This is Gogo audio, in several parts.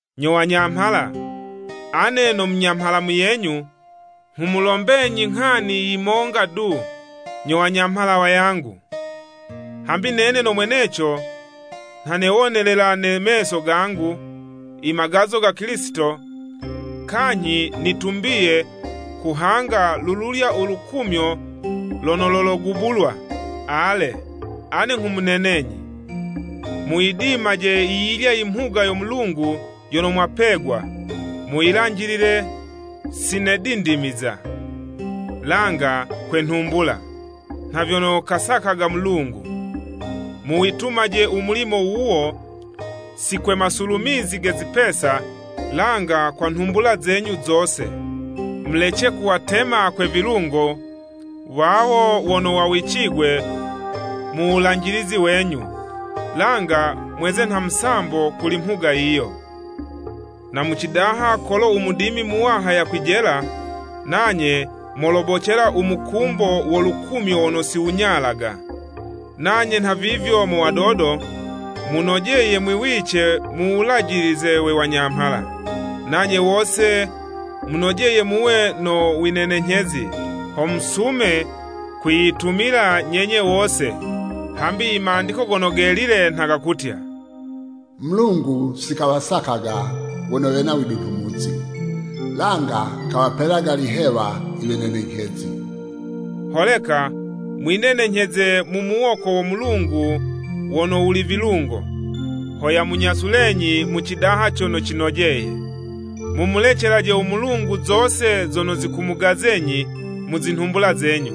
Nyo wanyamhala! Ane no munyamhala muyenyu, nghumulombenyi nghani yi monga du, nyo wanyamhala wayangu. Hambi nene no mweneco nha newonelela ne meso gangu, imagazo ga Kilisito kanyhi nitumbiye kuhanga lululya u lukumyo lono lologubulwa. Ale, ane nghumunenenyi, muyidimaje yiyilya imhuga yo Mulungu yono mwapegwa, muyilanjilile, si ne dindimiza langa kwe nhumbula, nha vyono kasakaga Mulungu. Muwitumaje u mulimo wuwo si kwe masulumizi ge zipesa, langa kwe nhumbula zenyu zose. Mulece kuwatema kwe vilungo wawo wono wawicigwe mu wulanjilizi wenyu, langa mweze nha musambo kuli mhuga yiyo. Na mu cidaha kolo u Mudimi Muwaha yakwijela, nanye molobocela u mukumbo wo lukumyo wono siwunyalaga. Nanye nhavivyo mo wadodo, munojeye mwiwice mu wulajilize we wanyamhala. Nanye wose munojeye muwe no winenenyhezi ho musume kwiyitumila nyenye wose, hambi i Mandiko Gono Gelile nha gakutya, “U Mulungu sikawasakaga wono wena widunhumuzi, langa kawapelaga lihewa iwenenenyhezi.” Holeka mwinenenyheze mu muwoko wo Mulungu wono wuli vilungo, ho yamunyasulenyi mu cidaha cono cinojeye. Mumulecelaje u Mulungu zose zono zikumugazenyi mu zinhumbula zenyu.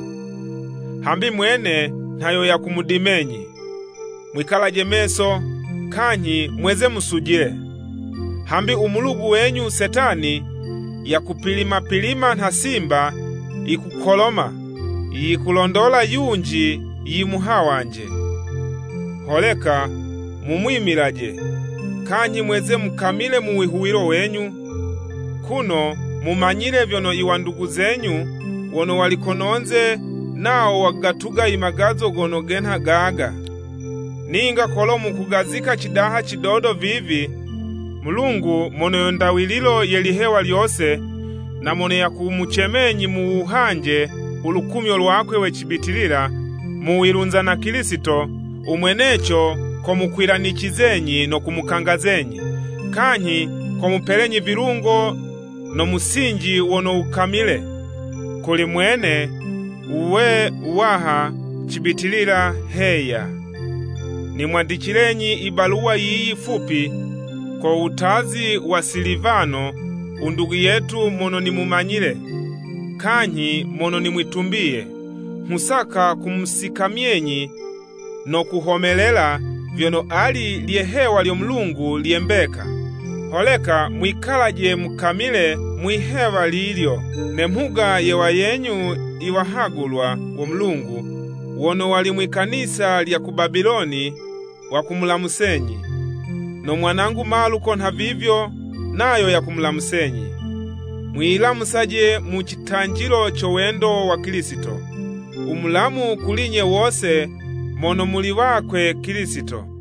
Hambi mwene nha yo yakumudimenyi. Mwikalaje meso, kanyhi mweze musujile. Hambi umulugu wenyu Setani, yakupilima pilima nha simba yikukoloma, yikulondola yunji yimuhawanje. Holeka mumwimilaje, kanyhi mweze mukamile mu wihuwilo wenyu, kuno mumanyile vyono i wandugu zenyu wono wali kono'nze, nawo wakugatuga i magazo gono genha gaga. Ninga kolo mukugazika cidaha cidodo vivi, Mulungu mono yo ndawililo ye lihewa lyose na mono yakumucemenyi muwuhanje ulukumyo lwakwe we cibitilila muwilunza na Kilisito, umweneco komukwilanicizenyi no kumukangazenyi, kanyhi komupelenyi vilungo no musinji wono wukamile. Kuli mwene wuwe wuwaha cibitilila! Heya. Nimwandicilenyi i baluwa yiyi fupi, ko wutazi wa Silivano u ndugu yetu mono nimumanyile kanyhi mono nimwitumbiye. Nghusaka kumusikamyenyi no kuhomelela vyono ali lye'hewa lyo Mulungu lye mbeka. Holeka mwikalaje mukamile mwihewa lilyo. Ne mhuga ye wayenyu i wahagulwa wo Mulungu wono wali mwi'kanisa lya ku Babiloni wakumulamusenyi. No mwanangu Maluko nhavivyo nayo yakumulamusenyi. Mwiyilamusaje mu citanjilo co wendo wa Kilisito. U mulamu kuli'nye wose mono muli wakwe Kilisito.